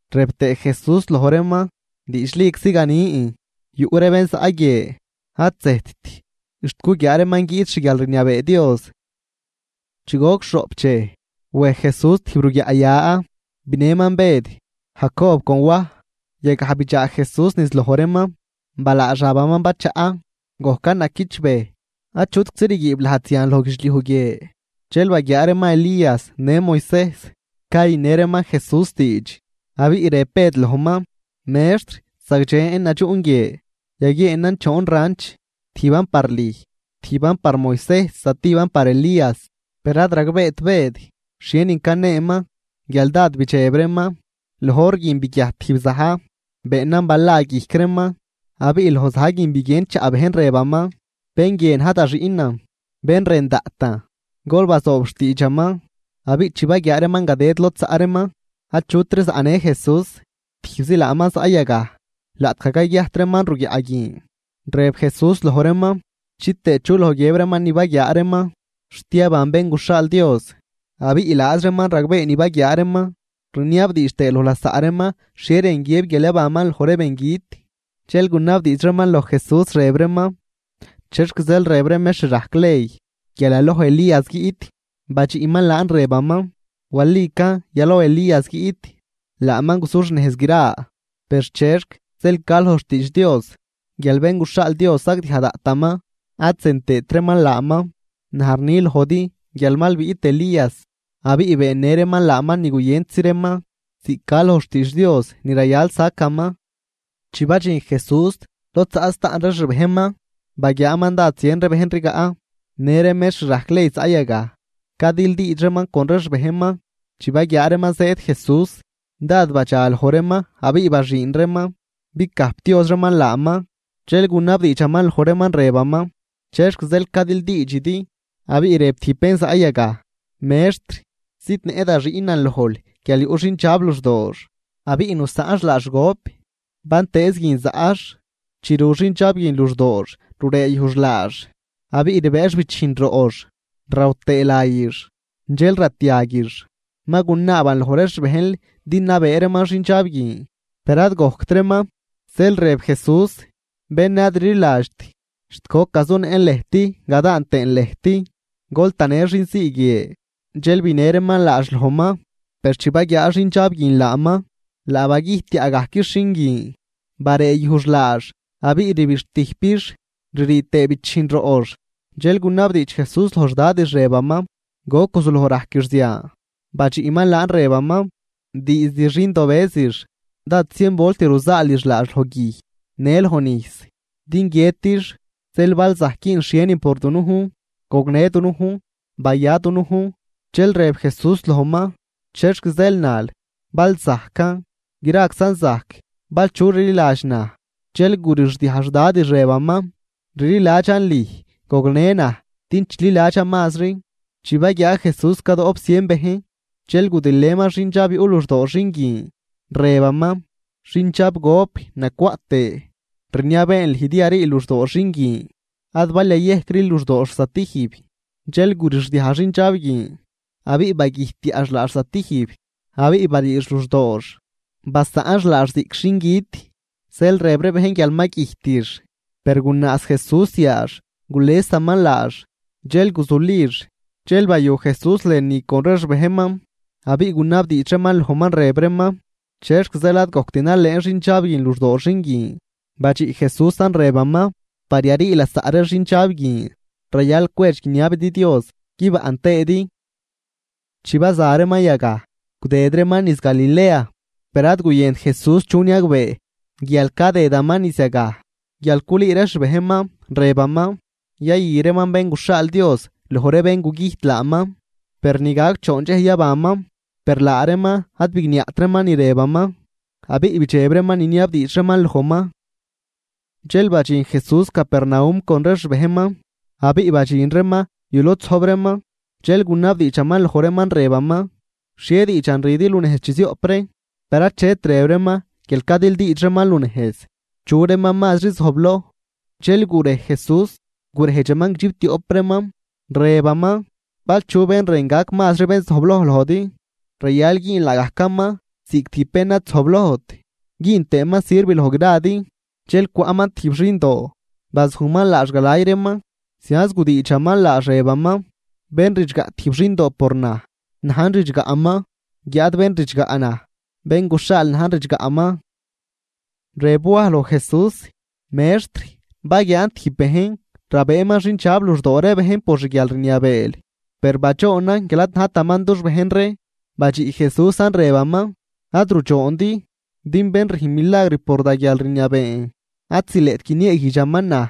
Rëb tëë Jesús loj reeman: ―Diidxliczi ganin, yuꞌ ree bén zaꞌ guie, ad zëjtt xt guguiaa reeman guiꞌt xguialrniabee Dios. Chi goc xhoꞌp dxej, wej Jesús tijb ruguiaꞌya, binëman Bëd, Jacob con Waj. Yagaj bidxaa Jesús niz loj reeman. Balaa xabaman bachaꞌ, gojcan naquichbëj, achutczi rguiib lajd zian loj guidxliuj guie. Dxel baguiaa reeman Elías në Moisejs cayünë reeman Jesús diidx. Abiꞌ rëb Bëd lojman: ―Mextr, ¡zagdxen nadxuꞌn guie! Yaguieenan choon ranch, tijban par lüj, tijban par Moisejs, zatijban par Elías. Per ad ragbeet Bëd xhienin caneeman guial dád bidxeb reeman. Loj hor guin biguiajt tijb za̱j beenan bala guijc reeman, abiꞌ loj za̱j guin biguien chaꞌ bejn rëbaman: ―Bén guie na̱j da Xiꞌnan, bén rën daꞌtan, gol bazoob xtiidxaman. Abiꞌ chi baguiaa reeman gadëd lod zaꞌ reeman achutri zaꞌnë Jesús, tijbzi laaman zaꞌ yagaj. Laꞌtgaj cayguiajt reeman ruguiaꞌ guin, rëb Jesús loj reeman chitëë chu loj guiëb reeman ni baguiaa reeman, xt yaban Bén guxhaal Dios. Abiꞌ laaz reeman ragbee ni baguiaa reeman, rniabdiidx tëë loj lasaꞌ reeman xhie rën guiëb guial yabanman loj ree bengüt. Dxel gunabdiidx reeman loj Jesús, rëb reeman: ―¿Chexc zeel rëb ree mextr rajc ley guial yaloj Elías guiꞌt? Badxiꞌman laan rëbaman: ―Walican yaloj Elías guiꞌt, laaman guzuxnejz gra. Per, ¿chexc zeel ca loj xtiidx Dios guial Bén guxhaal Dios sagdiaj daꞌtaman ad zën tëët reeman laaman? Naj rni lojdi guial mal biꞌt Elías, abiꞌ beennë reeman laaman ni guyëntzi reeman ziꞌc ca loj xtiidx Dios ni rayal sacaman. Chi badxin Jesús lod zaꞌ staꞌn ree xbejnman, baguiaaman dád zien bejn rigaꞌ, në ree mextr rajc ley zaꞌ yagaj cadildiidx reeman con ree xbejnman. Chi baguiaa reeman zëëd Jesús, dád badxa loj reeman abiꞌ baxüün reeman bicajpdioz reeman laaman. Dxel gunabdiidxaman loj reeman rëbaman: ―¿Chexc zeel cadildiidxidi? Abiꞌ rëb tijb bén zaꞌ yagaj: ―Mextr, zidnëꞌ da xiꞌnan lojl guial yuꞌ xindxab luxdoox abiꞌ nusaꞌnx laax gop. Bantëëz guin zaꞌx, chi ru xindxab guin luxdoox rureeyujx laax, abiꞌ rbëëx bichijn roꞌx, raw tëë ree layix, dxel ratiaguix. Ma gunaaban loj ree xbejnl din nabëë reeman xindxab guin, per ad gojct reeman. Zeel rëb Jesús: ―¡Bén ad rliladxt! ¿Xt goc gazunëꞌn lëjt gadaan tëën lëjt? Gol tanë xinzii guie. Dxel binë reeman laax lojman. Per chi baguiaa xindxab guin laaman, laa bagüjtyaꞌgajquix xin guin, bareeyujx laax abiꞌ rbixtüjpix ririi tëë bichijn roꞌx. Dxel gunabdiidx Jesús loj xdadix rëbaman: ―¿Goc guzuloj rajquix zian? Badxiꞌman laan rëbaman: ―Diizd xindobëzix. Dád zien volt ruzaalix laax loj guij në loj nijs din guiëtix. Zeel bal zajc güünl xhienin por dunujn, gognë dunujn, baya dunujn. Dxel rëb Jesús lojman: ―¿Chexc zeel nal, “bal zajcan”? Graczan zajc bal chu rliladx naj. Dxel gurixdiaj xdadix rëbaman: ―¡Rliladxan lüj, gognë naj din chililadxan mazri! Chi baguiaa Jesús cadoꞌp zien bejn dxel gudilëman xindxab yuꞌ luxdoo xin guin, rëbaman: ―Xindxab gop nacwaꞌt tëë, rniabeen lüj din yariil luxdoo xin guin. Ad bal yayejcril luxdoox zatijb. Dxel gurixdiaj xindxab guin, abiꞌ bagüjtyaꞌx laax zatijb abiꞌ bariix luxdoox, basaꞌnx laax ziꞌc xingüt zeel rëb ree bejn guial ma güjtix. Per gunaaz Jesús yaax gulesaman laax, dxel guzulix. Dxel bayu Jesús lënü con ree xbejnman, abiꞌ gunabdiidx reeman lojman, rëb reeman: ―¿Chexc zeel ad gojct nalëën xindxab guin luxdoo xin guin? Badxiꞌ Jesúsan rëbaman: ―Par yarii lasaꞌ ree xindxab guin, rayal cwedx guiniabidi Dios guibaꞌn tëëdi. Chi baza reeman yagaj, gudëd reeman niz Galilea, per ad guyënt Jesús chu niagbee guial cadëdaman niz yagaj, guial culüü ree xbejnman, rëbaman: ―Yayü reeman Bén guxhaal Dios loj ree bén gugüjt laaman, per ni gac choon dxej yabanman. Per laa reeman ad bigniaꞌt reeman ni rëbaman, abiꞌ bidxeb reeman niniabdiidx reeman lojman. Dxel badxin Jesús Capernaum con ree xbejnman, abiꞌ badxin reeman yu lod zojb reeman. Dxel gunabdiidxaman loj reeman rëbaman: ―¿Xhie diidxan rüdi lunejz chi zioꞌp ree? Per achet rëb reeman guial cadildiidx reeman lunejz chu reeman mazri zojbloj. Dxel gurej Jesús, gurejdxaman guidxiptioꞌp reeman, rëbaman: ―Bal chu bén rën gac mazri bén zojbloj lojdi, rayal güün laagajcaman ziꞌc tijb bén ad zojblojt güün tëëman sirv loj gradi. Dxel cwaꞌman tijb xindoo, bazujman laax galay reeman, zianz gudiidxaman laax, rëbaman: ―Bén ridxgaꞌ tijb xindoo por naj, najn ridxgaꞌman, guiáad bén ridxgaꞌ naj, bén guxhaal najn ridxgaꞌman. Rëb Waj loj Jesús: ―Mextr, baguiaan tijb bejn rabëëman xindxab luxdoo ree bejn por xguialrniabeel. Per badxoonan guial ad najtaman dux bejn ree. Badxiꞌ Jesúsan rëbaman: ―Ad rudxoondi, din bén rüjn milagr por da guialrniabeen, ad zileꞌt guinieeguijdxaman naj.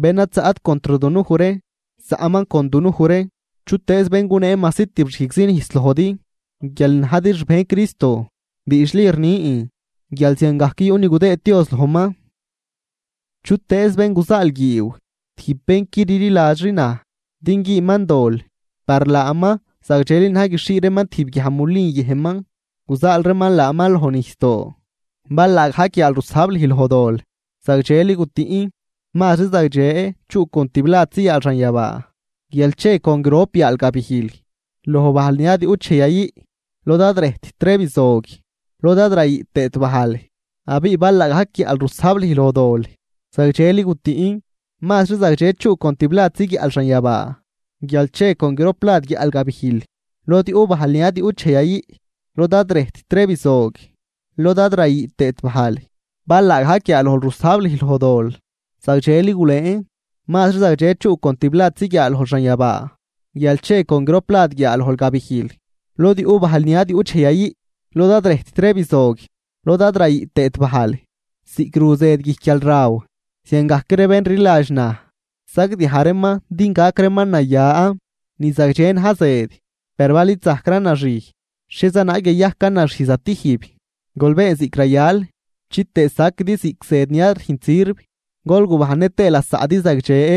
Bén ad zaꞌt contr dunuj ree, zaꞌman con dunuj ree. Chutëëz bén gunee majsi tibxijgzi nijs lojdi guial najdi xbejn Cristo, diidxli rnin guial ziangajc yuꞌ ni gudëëd Dios lojman. ’Chutëëz bén guzaalguiiw tijb bén qui rliladxri naj din güünman dol, par laaman zagdxeli na̱j guixhii reeman tijb guiaj mulin yëjnman guzaal reeman laaman loj nijsdoo. Bal laagajc yaal rusajb lüj loj dol, zagdxeli gutüꞌn. Mazri zagdxe chuꞌ con tibladzi yaal xanyabaa, guial che con grop yaal gabijl loj bajl ni ad yuꞌt dxej yayüꞌ, lod ad rëjtt ree bizog lod ad rayüꞌ tëët bajl. Abiꞌ bal laagajc guiaꞌl rusajb lüj loj dol, zagdxeli gutüꞌn. Mazri zagdxe chuꞌ con tibladzi guiaꞌl xanyabaa guial che con groplad guiaꞌl gabijl lod yuꞌ bajl ni ad yuꞌt dxej yayüꞌ, lod ad rëjtt ree bizog lod ad rayüꞌ tëët bajl. Bal laagajc guiaalojl rusajb lüj loj dol, zagdxeli gulëën. Mazri zagdxe chuꞌ con tibladzi guiaalojl xanyabaa guial che con groplad guiaalojl gabijl lod yuꞌ bajl ni ad yuꞌt dxej yayüꞌ, lod ad rëjtt ree bizog lod ad rayüꞌ tëët bajl. ’Ziꞌc ru zëd guijc guialraw, ziangajc ree bén rliladx naj sagdiaj reeman din gac reeman naya. ’Ni zagdxe na̱j zëd, per bal id zajcran naxij, ¿xhieza naag yayajcan naxij zatijb? Gol been ziꞌc rayal chitëë saquidi ziꞌc zëd ni ad rüjnt sirv, gol gubajnnë tëë lasaꞌdi zagdxe.